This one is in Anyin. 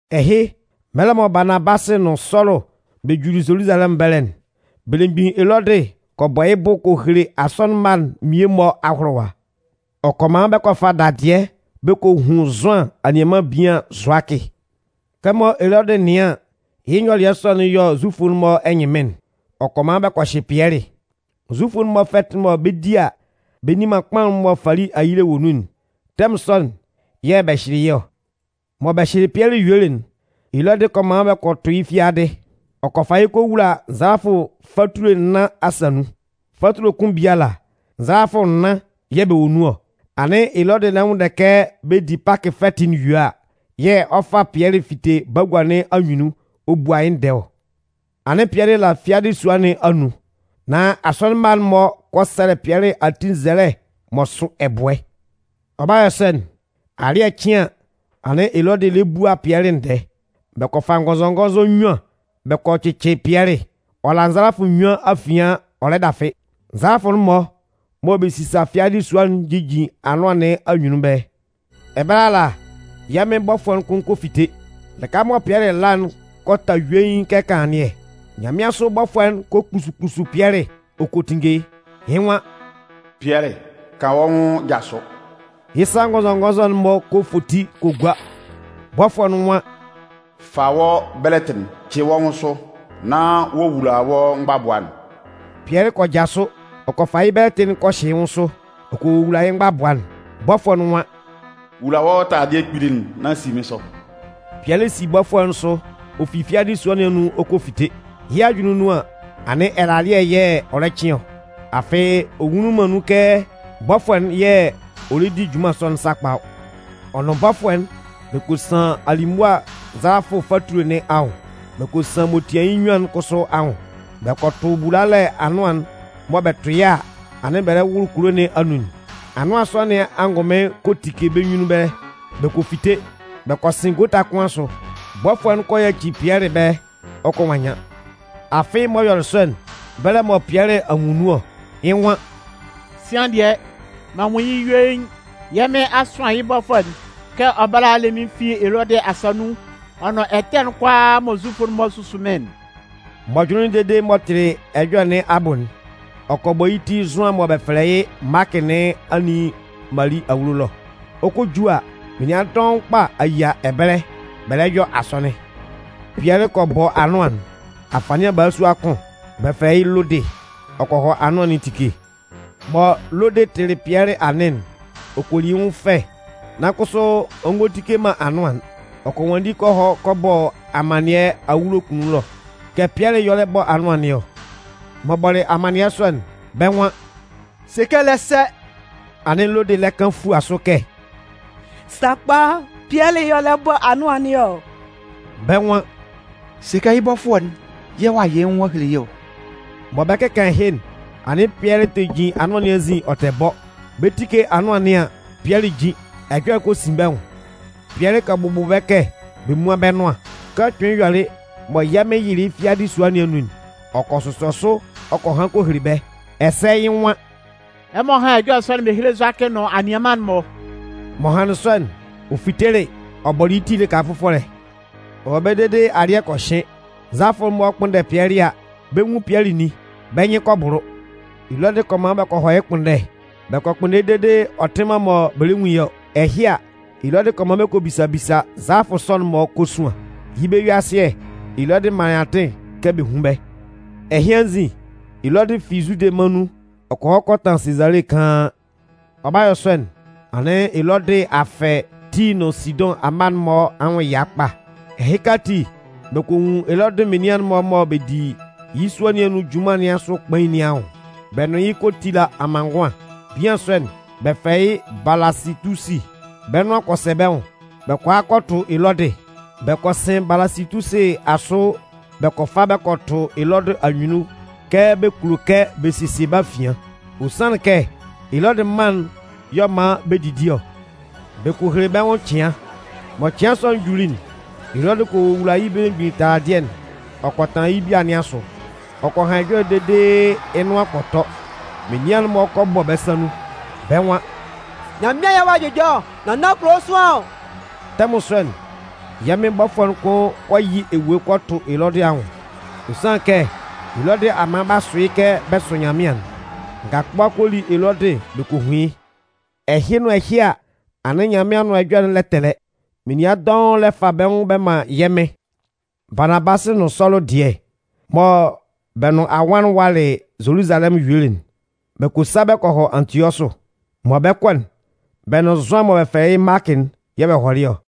Ɛhɩ, mɛlɛ mɔ Baanabasɩ nʋn Sɔlʋ bɛ juli Zoluzalɛmʋn ɛbɛlɛ'n, belemgbin Elɔdɩ kɔ bɔ yɩ́ bʋ ɔ kɔ hele asɔnɩn mma'n mmie-mɔ ahʋlʋwa. Ɔ kɔ man bɛ kɔ fa dadɩɛ bɛ kɔ hun Zʋan anianman bian Zʋakɩ. Kɛmɔ Elɔdɩ nɩan an, yɩ́ nyɔlɩɛ sɔ'n yɔ Zufʋ'n-mɔ ɛnyɩnmɩn'n, ɔ kɔ man bɛ kɔ hyɩ Pɩɛlɩ. Zufʋ'n-mɔ fɛtɩ'n mɔ bɛ 'di a, bɛ nni man kpaʋn'n mɔ fali ayile wɔ nun'n tɛmʋn sɔ'n yɛ̂ bɛ hyɩlɩ yɩ́ ɔ. Mɔ bɛ hyɩlɩ Pɩɛlɩ yuelɩ'n, Elɔdɩ kɔ man bɛ kɔ tʋ yɩ́ fiadɩ. Ɔ kɔ fa yɩ́ kɔ wula nzalafʋ fatule nnan asa nun. Fatule kʋn biala, nzalafʋ nnan yɛ̂ bɛ wɔ nun ɔ. Anɩn Elɔdɩ lɛ nwʋnndɛ kɛ bɛ di Pakɩ fɛtɩ'n yue a, yɛ̂ ɔ 'fa Pɩɛlɩ fite bagua nɩn anyunnun ɔ bua yɩ́ ndɛɛ ɔ. Anɩn Pɩɛlɩ la fiadɩ sua nɩn anun, nan asɔnɩn mma'n-mɔ kɔ sɛlɛ Pɩɛlɩ ati nzɛlɛ m'ɔ sʋ ɛbʋɛ. Ɔ 'ba yɔ sɔ'n, alɩ́ɛ cɩn an, anɩn Elɔdɩ lɛ bua Pɩɛlɩ ndɛɛ. Bɛ kɔ fa ngɔnzɔngɔnzɔ nnyuan bɛ kɔ cɩcɩ Pɩɛlɩ, ɔ la nzalafʋ nnyuan afian ɔ lɛ dafɩ. Nzalafʋɛ'n-mɔ mɔ bɛ sisa fiadɩ sua'n jijin anʋan nɩn anyunnun ɛbɛlɛ. Ɛbɛlɛ ala, yɛ̂ Mɩn bɔfʋɛ'n kʋn kɔ fite. Lɩka mɔ Pɩɛlɩ la'n kɔ ta yuein kɛ kanlannɩɛ. Nyanmɩansʋ bɔfʋɛ'n kɔ kpusu kpusu Pɩɛlɩ ɔ kɔ tinnge yɩ́. Yɩ́ nwan: “Pɩɛlɩ, kan wɔ́ nwʋn jasʋ!” Yɩ́ sa ngɔnzɔngɔnzɔ'n-mɔ kɔ foti kɔ gua. Bɔfʋɛ'n nwan: “Fa wɔ́ bɛlɛtɩ'n cɩ wɔ́ nwʋn sʋ nán wowula wɔ́ mgbabʋa'n.” Pɩɛlɩ kɔ jasʋ ɔ kɔ fa yɩ́ bɛlɛtɩ'n kɔ hyɩ yɩ́ nwʋn sʋ ɔ kɔ wowula yɩ́ mgbabʋa'n. Bɔfʋɛ'n nwan: “Wula wɔ́ taladɩɛ kpili'n nán si mɩ́n sʋ.” Pɩɛlɩ si bɔfʋɛ'n sʋ ɔ fi fiadɩ sua nɩn anun ɔ kɔ fite. Yɩ́ ajʋnlɩn nun an, anɩn ɛlalɩɛ yɛ̂ ɔ lɛ cɩn ɔ. Afɩ ɔ nwunlin man nun kɛ bɔfʋɛ'n yɛ̂ ɔ lɛ di junman sɔ'n sakpa ɔ. Ɔ nʋn bɔfʋɛ'n, bɛ kɔ san alimʋa nzalafʋ fatule nɩn anwʋn, bɛ kɔ san m'ɔ tian yɩ́ nnyuan'n kʋsʋ anwʋn. Bɛ kɔ tʋ bulalɛ anʋan'n mɔ bɛ tʋ yɩ́ a, anɩn bɛ lɛ wʋlʋ kulo nɩn anun'n. Anʋan sɔ nɩn angʋnmɩn kɔ tike bɛ́ nyunnun ɛbɛlɛ. Bɛ kɔ fite. Bɛ kɔ sɩn gota kʋn asʋ, bɔfʋɛ'n kɔ yaci Pɩɛlɩ ɛbɛlɛ ɔ kɔ nwannyan. Afɩ m'ɔ yɔlɩ sɔ'n, bɛlɛ mɔ Pɩɛlɩ a nwun nun ɔ. Yɩ́ nwan: “Sɩan dɩɛ, m'an nwun yɩ́ yuein. Yɛ́ Mɩn a sʋan yɩ́ bɔfʋɛ'n kɛ ɔ bála a le mɩ́n fi Elɔdɩ asa nun ɔ nʋn ɛtɛ'n kʋalaa mɔ Zufʋ'n-mɔ susu mɩ́n'n.” M'ɔ jʋnlɩnlɩn dede m'ɔ tɩlɩ ɛjɔlɛ nɩn abʋ'n, ɔ kɔ bɔ yɩ́ ti Zʋan mɔ bɛ fɛlɛ yɩ́ Maakɩ nɩn anin Mali awulo ɛlɔ. Ɔ 'kɔ a ju a, menian dɔʋn kpa a yia ɛbɛlɛ bɛ lɛ yɔ asɔnɩn. Pɩɛlɩ kɔ bɔ anʋan'n. Afanɩan balasua kʋn, bɛ fɛlɛ yɩ́ Lodɩ, ɔ kɔ hɔ anʋan nɩn etike. Mɔ Lodɩ tɩlɩ Pɩɛlɩ anɩn'n, ɔ kɔ li yɩ́ nwʋn fɛ nan kʋsʋ ɔ ngɔ tike man anʋan'n. Ɔ kɔ nwanndi kɔ hɔ kɔ bɔ amannɩɛ awulo kunnun ɛlɔ kɛ Pɩɛlɩ y'ɔ lɛ bɔ anʋan nɩn ɔ. M'ɔ bɔlɩ amannɩɛ sɔ'n, bɛ́ nwan: “Se kɛ ɛ lɛ sɛ!” Anɩn Lodɩ lɛ kan fua sʋ kɛ: “Sakpa, Pɩɛlɩ y'ɔ lɛ bɔ anʋan nɩn ɔ.” Bɛ́ nwan: “Sɛ kɛ yɩ́ bɔfʋɛ'n yɛ̂ ɔ'a yɩ yɩ́ nwun ɔ'a hele yɩ́ ɔ.” Mɔ bɛ 'kɩkan ɛhɩ'n, anɩn Pɩɛlɩ tɛ jin anʋan nɩn anzin ɔ tɛ bɔ. Bɛ 'tike anʋan nɩn an, Pɩɛlɩ jin. Ɛjɔlɛ'n kɔ sin bɛ́ nwʋn. Pɩɛlɩ kɔ bʋbʋ bɛ́ kɛ bɛ múan bɛ́ nʋan. Kɛ ɔ kpɩnlɩn yɔlɩ mɔ yɛ̂ Mɩn yɩlɩ yɩ́ fi fiadɩ sua nɩn anun'n, ɔ kɔ sʋsɔ sʋ ɔ kɔ han kɔ hele bɛ́. Ɛsɛ yɩ́ nwan: “Ɛmɔ hán ɛjɔlɛ sɔ'n bɛ hele Zʋakɩ nʋn anianman'n-mɔ.” M'ɔ hanlɩn sɔ'n, ɔ fitelɩ ɔ bɔlɩ yɩ́ ti lɩka fʋfɔlɛ. Ɔ wɔ ɛbɛlɛ dede alɩ́ɛ kɔ hɩn. Nzalafʋ'n-mɔ kpʋnndɛ Pɩɛlɩ a, bɛ nwun Pɩɛlɩ nin. Bɛ́ nyɩn kɔ bʋlʋ. Elɔdɩ kɔ man bɛ kɔ hɔ yɩ́ ɛkpʋnndɛ. Bɛ kɔ kpʋnndɛ yɩ́ dede ɔ tɩ man mɔ bɛ lɛ nwun yɩ́ ɔ. Ɛhɩ a, Elɔdɩ kɔ man bɛ kɔ bisa bisa nzalafʋ sɔ'n-mɔ kosuan. Yɩ́ bɛ-yue-asɩɛ, Elɔdɩ manlɩn atɩn kɛ bɛ hún bɛ́. Ɛhɩ anzin, Elɔdɩ fi Zude mân nun ɔ kɔ hɔ kɔ tanlan Sezale kaan. Ɔ 'ba yɔ sɔ'n, anɩn Elɔdɩ a fɛ Tii nʋn Sidʋn amma'n-mɔ anwʋn ɛya kpa. Ɛhɩka ati, bɛ kɔ nwun Elɔdɩ menian'n-mɔ mɔ bɛ di yɩ́ sua nɩn anun junman nɩn asʋ kpain nɩn anwʋn bɛ nʋn yɩ́ kɔ tila amanngʋan. Bian sɔ'n, bɛ fɛlɛ yɩ́ Balasɩtusi. Bɛ́ nʋan kɔ sɛ bɛ́ nwʋn, bɛ kɔ a kɔ tʋ Elɔdɩ. Bɛ kɔ sɩn Balasɩtusi asʋ bɛ kɔ fa bɛ kɔ tʋ Elɔdɩ anyunnun kɛ bɛ kulo kɛ bɛ sesie bɛ́ afian. Ɔ sanlɩn kɛ, Elɔdɩ mân'n y'ɔ man bɛ didi ɔ. Bɛ kɔ hele bɛ́ nwʋn cɩan. Mɔ cɩan sɔ'n juli'n, Elɔdɩ kɔ wula yɩ́ belemgbin taladɩɛ'n ɔ kɔ tanlan yɩ́ bia nɩn asʋ. Ɔ kɔ han ɛjɔlɛ dede yɩ́ nʋan kɔ tɔ. Menian'n-mɔ kɔ bɔ bɛ́ sa nun. Bɛ́ nwan: “Nyanmɩan yɛ̂ ɔ'a jʋjɔ ɔ, nán nan kulo sʋanlan ɔ!” Tɛmʋn sɔ'n, yɛ́ Mɩn bɔfʋɛ'n kʋn kɔ yɩ ewue kɔ tʋ Elɔdɩ anwʋn. Ɔ sanlɩn kɛ, Elɔdɩ a man b'a sʋ yɩ́ kɛ bɛ sʋ Nyanmɩan'n. Ngakʋba kɔ li Elɔdɩ bɛ kɔ hun yɩ́. Ɛhɩ nʋn ɛhɩ a, anɩn Nyanmɩan Anʋan Ɛjɔlɛ'n lɛ tɛlɛ, menian dɔʋn lɛ fa bɛ́ nwʋn bɛ man yɛ́ Mɩn. Baanabasɩ nʋn Sɔlʋ dɩɛ, mɔ bɛ nʋn anwan'n walɩ Zoluzalɛmʋn yuelɩ'n, bɛ kɔ sa bɛ kɔ hɔ Antiɔsʋ. Mɔ bɛ 'kɔ'n, bɛ nʋn Zʋan mɔ bɛ fɛlɛ yɩ́ Maakɩ'n yɛ̂ ɔ hɔlɩ ɔ.